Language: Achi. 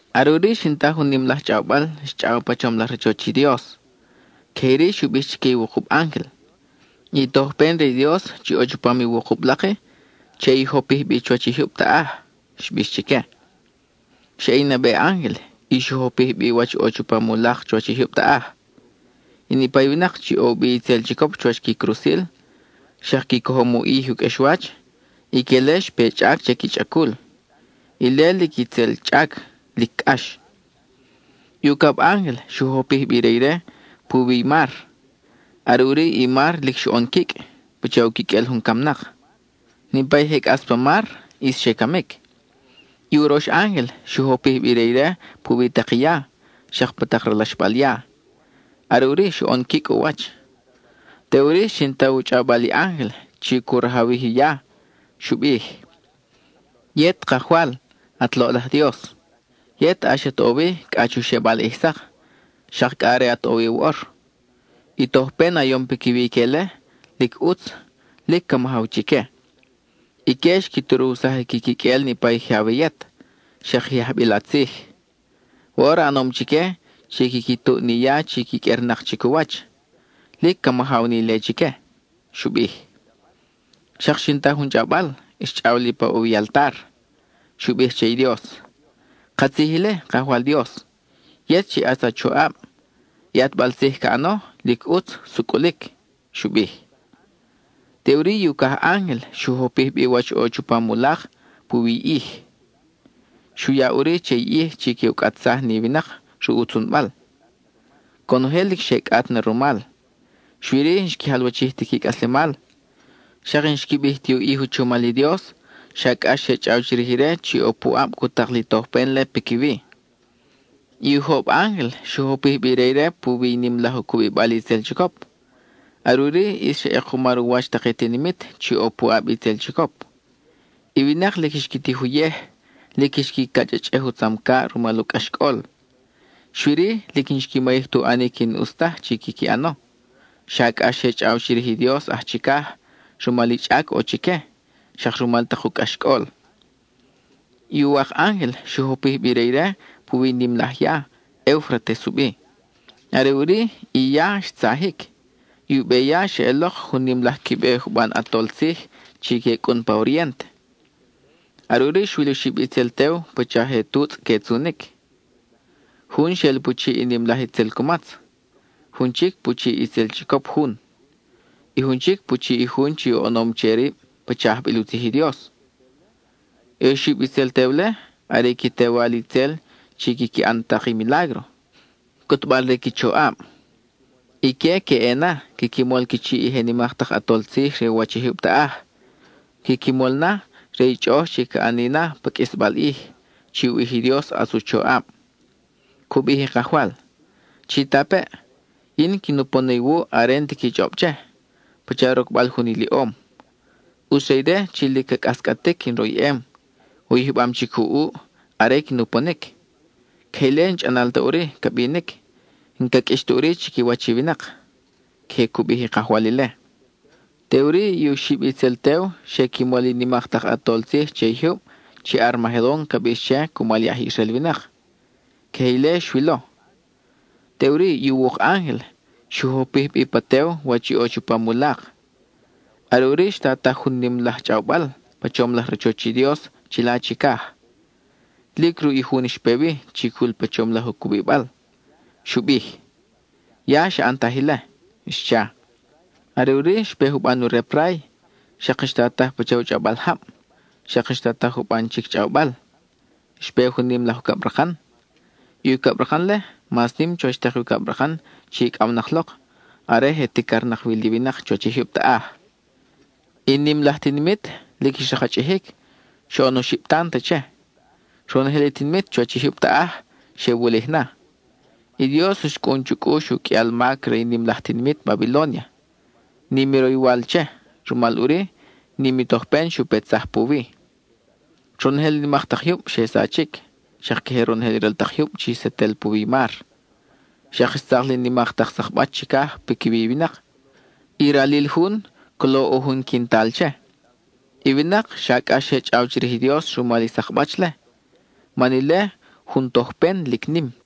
Are ʼuri xin ta jun nim laj chʼawbal, xchʼaw pa chom laj rachoch i Dios. Queje iri xu bij chique i wukub ángel: —I tojpen re i Dios chi ʼo chupam i wukub lak-i, che i jopij bi chuwach i jyub taʼaj —xbix chique. Xa ʼe i nabe ángel y xu jopij bi wach ʼo chupam u lak chuwach i jyub taʼaj. I niʼpa i winak chi ʼo u bi itzel chicop chuwach qui crusil, xak qui cojom u ʼij i u qʼuexwach, ique-le xpe chʼac che i qui chʼacul. Ile, lic itzel chʼac, lic cʼax. I ucab ángel xu jopij bi i re ire puwi i mar. Are ʼuri i mar lic xoʼon quicʼ, pacha u quiqʼuel jun camnak. Niʼpa i je cʼas pa mar ʼis xe camic. I urox ángel xu jopij bi i re ire puwi tak i ya, xak pa tak ralaxbal ya; are ʼuri xoʼon quicʼ u wach. Teʼuri xin ta u chʼawbal i ángel chi cu rajawij i ya; xu bij: —Yet Kajwal, at loʼlaj Dios, yet ʼax at ʼo wi cʼa chu xebal ʼij sak, xak cʼa are at ʼo wi woʼor. I a tojpen a yom piquiwi ique-le, lic ʼutz, lic ca majaw chique. Ique xqui turuwsaj i qui quiqʼuel niʼpa i je awe yet, xak i je ajbil a tzij. Woʼor a ʼanom chique chi quiqui tuʼ ni ya chi quiqʼuernak chic u wach; lic ca majaw ni ile chique —xu bij. Xak xin ta jun chʼawbal, xchʼaw li pa ʼo wi i altar. Xu bij che i Dios: —Katzij ile, Kajwal Dios, yet chi ʼatz a choʼab; i ʼatbal tzij ca ʼano, lic ʼutz, sucʼulic —xu bij. Teʼuri i ucaj ángel xu jopij bi wach ʼo chupam u lak puwi i ʼij. Xu ya ʼuri che i ʼij chi que u cʼatsaj ni winak ruʼ u tzunbal. Conojel lic xe cʼat na rumal, xui-ri, n-xqui jalwachij ti qui cʼaslemal. Xak n-xqui bij ti u ʼij u chomal i Dios, xa cʼax xe chʼaw chirij ire chi ʼo puʼab cu tak li tojpen-le piquiwi. I ujob ángel xu jopij bi i re ire puwi i nim laj u cubibal i itzel chicop; are ʼuri ʼis xa ʼekumar u wach tak i tinimit chi ʼo puʼab i itzel chicop. I winak lic xqui tij uyej, lic xqui cachʼachʼej u tzamcaʼ rumal u cʼaxcʼol. Xui-ri, lic n-xqui mayij tu ʼanic i n-ʼus taj chi quiqui ʼano, xa cʼax xe chʼaw chirij i Dios aj chicaj rumal i chʼac ʼo chique, xak rumal tak u cʼaxcʼol. I uwak ángel xu jopij bi i re ire puwi i nim laj ya, Eufrates u bi. Are ʼuri, i ya xtza-jic; i u beya xeʼelok jun nim laj qui be juban ʼatol tzij chi que cʼun pa orient. Are ʼuri xwil oxib itzel tew pacha je tutzʼ que tzunic. Jun xel pu chiʼ i nim laj itzel cumatz; jun chic pu chiʼ i itzel chicop jun; y jun chic pu chiʼ i jun chi oʼonom che rib pacha ajbil u tzij i Dios. I oxib itzel tew-le are i qui tewal itzel chi quiqui ʼan tak i milágro, cʼutbal re qui choʼab. Ique que ʼe na, quiqui mol qui chiʼ i je nimak tak ʼatol tzij re u wach i jyub taʼaj. Que qui mol na, re i chʼoʼoj chi ca ʼani na pa qʼuisbal ʼij, chi u ʼij i Dios ʼatz u choʼab. Cu bij i Kajwal: “Chitapeʼ, yin quin upon na iwuʼ are n-ti qui chʼob che, pacha rocbal jun iliʼom. ʼUtz re ire chi lic ca cʼascʼatic in royʼem, u yijbam chic u ʼuʼ, are quin uponic. Queje ile n-chʼanal ta ʼuri ca binic, n-ca qʼuix ta ʼuri chiquiwach i winak.” (Queje cu bij i Kajwal ile.) Teʼuri i oxib itzel tew xe qui mol i nimak tak ʼatol tzij che i jyub chi Armagedon ca bix che cumal i aj Israel winak. (Queje ile xwilo.) Teʼuri i uwuk ángel xu jopij bi pa tew wach i ʼo chupam u lak. Are ʼuri xtataj jun nim laj chʼawbal pa chom laj rachoch i Dios chila chicaj; lic ruʼ i jun xpe wi, chi cul pa chom laj u cubibal. Xu bij: —Ya xa ʼantaj ile —xcha. Are ʼuri xpe juban u rep ray, xak xtataj pacha u chʼawbal jab, xak xtataj juban chic chʼawbal. Xpe jun nim laj ucabrakan. I ucabrakan-le, mas nim chuwach tak i ucabrakan chi icʼawnak lok, are je ticarnak wi li winak chuwach i jyub taʼaj. I nim laj tinimit lic xrakchʼijic, xoʼon oxib tant che. Ronojel i tinimit chuwach i jyub taʼaj xe wulij na. I Dios xcʼun chu cʼux u qʼuial mac re i nim laj tinimit Babilónia; nim i roywal che, rumal ʼuri, nim i tojpen xu petsaj puwi. Ronojel i nimak tak jyub xe sachic, xak queje ronojel i ral tak jyub chi setel puwi i mar. Xak xtzak li nimak tak sakbach chicaj piquiwi i winak; i ralil jun, colo ʼo jun quintal che. I winak xa cʼax xe chʼaw chirij i Dios rumal i sakbach-le; man ile jun tojpen lic nim.